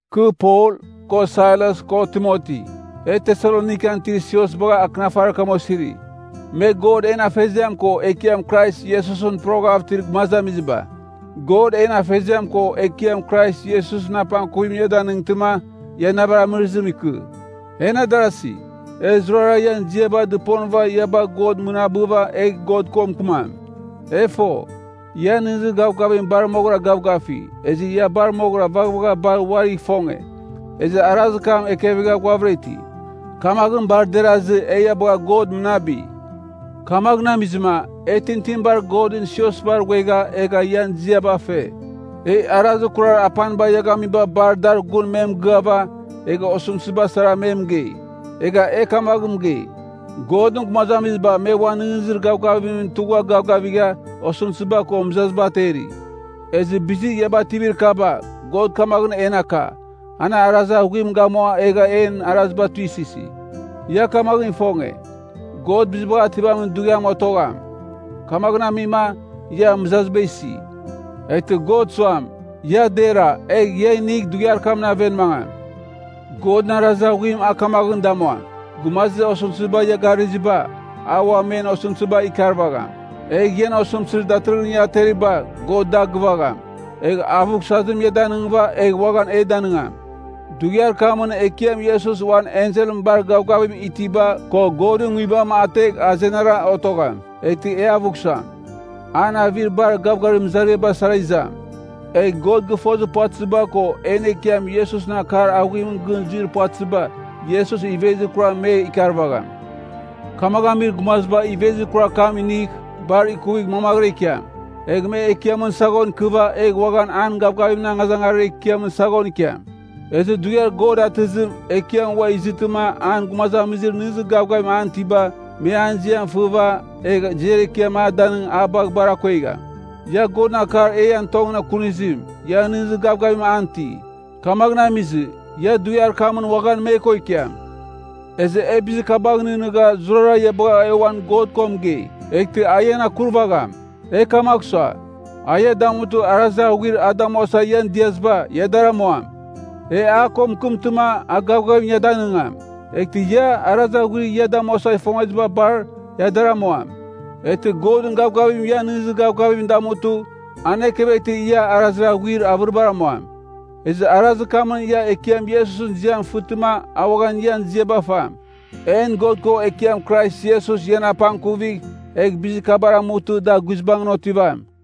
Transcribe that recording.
Kɨ Pol, ko Sailas ko Timoti, e Tesalonikan itir sios bagha akɨnafarir kam osiri, me God en Afeziam ko Ekiam Krais Iesusɨn poroghav itir gumazamiziba. God en Afeziam ko Ekiam Krais Iesusɨn apangkuvim ia damightɨma, ia navir amɨrɨzim ikɨ. En adarasi, e zurara ian ziaba dɨponɨva ia bagh God mɨnabɨva egh God ko mɨkɨmam. E fo, ian nɨghnɨzir gavgavim bar moghɨra gavgafi, ezɨ ia bar moghɨra vaghvagha bar uarigh ifonge, ezɨ arazir kam ekɨva ghuavɨra iti. Kamaghɨn bar derazɨ, e ia bagha God mɨnabi. Kamaghɨn amizɨma, e tintinibar Godɨn siosbar ghuegha egha ian ziaba fe. E arazir kurar apaniba ia gamiba bar dar gun me mɨgɨava, egha osɨmtɨziba sara me mɨgei. Egha e kamaghɨn mɨgei, “Godɨn gumazamiziba me uan nɨghnɨzir gavgavimɨn tugha gavgavigha, osɨmtɨziba ko mɨzaziba ateri.” Ezɨ bizir ia bativir kaba, God kamaghɨn en aka, an arazir aghuim gamua egha en araziba tuisɨsi. Ia kamaghɨn ifonge, God Bizibagh Ativamin Dughiam otogham. Kamaghɨn amima, ia mɨzaziba isi. Eghtɨ God suam, ia dera egh ia inigh dughiar kamɨn aven mangam. Godɨn arazir aghuim a kamaghɨn damuam, gumazir osɨmtɨziba ia garɨziba, a ua men osɨmtɨziba ikarvagham. Egh ian osɨmtɨzir datɨrɨghɨn ia ateriba God da gɨvagham, egh avughsazim ia danɨngɨva egh uaghan e danɨngam. Dughiar kamɨn Ekiam Iesus uan enselɨn bar gavgavim itiba ko Godɨn Nguibam ategh azenara otogham, eghtɨ e avughsam. An avir bar gavgavim mɨzariaba sara izam. Egh God gɨfozir puvatɨziba ko en Ekiam Iesusɨn akar aghuimɨn gɨn zuir puvatɨziba, Iesus ivezir kuram me ikarvagham. Kamaghɨn amir gumaziba ivezir kurar kam inigh; bar ikuvigh mamaghɨra ikiam. Egh me Ekiamɨn saghon ikɨva, egh uaghan an gavgavimɨn angazangarir ekiamɨn saghon ikiam. Ezɨ Dughiar God atɨzim, Ekiam ua izɨtɨma an gumazamizir nɨghnɨzir gavgavim an itiba, me an ziam fɨva, egh ziar ekiam a danɨng a bagh bar akuegham. Ia Godɨn akar e ian tongɨn kunizim, ia nɨghnɨzir gavgavim an iti. Kamaghɨn amizɨ, ia dughiar kamɨn uaghan me ko ikiam. Ezɨ e bizir kabagh nɨghnɨgha zurara ia bagha e uan God ko mɨgei, eghtɨ a ian akurvagham. E kamagh sua, a ia damutɨ arazir aghuir a damuasa ian diaziba, ia dar amuam. E a ko mɨkɨmtɨma, a gavgavim ia danɨngam. Eghtɨ ia, arazir aghuir ia damuasa ifongeziba bar, ia dar amuam. Eghtɨ Godɨn gavgavim ian nɨghnɨzir gavgavim damutɨ, an ekeveghtɨ ia arazir aghuir avɨribar amuam. Ezɨ arazir kamɨn ia Ekiam Iesusɨn ziam fɨtɨma a uaghan ian ziaba fam. En God ko Ekiam Krais Iesus ian apangkuvigh egh bizir kabar amutɨ da guizbangɨn otivam.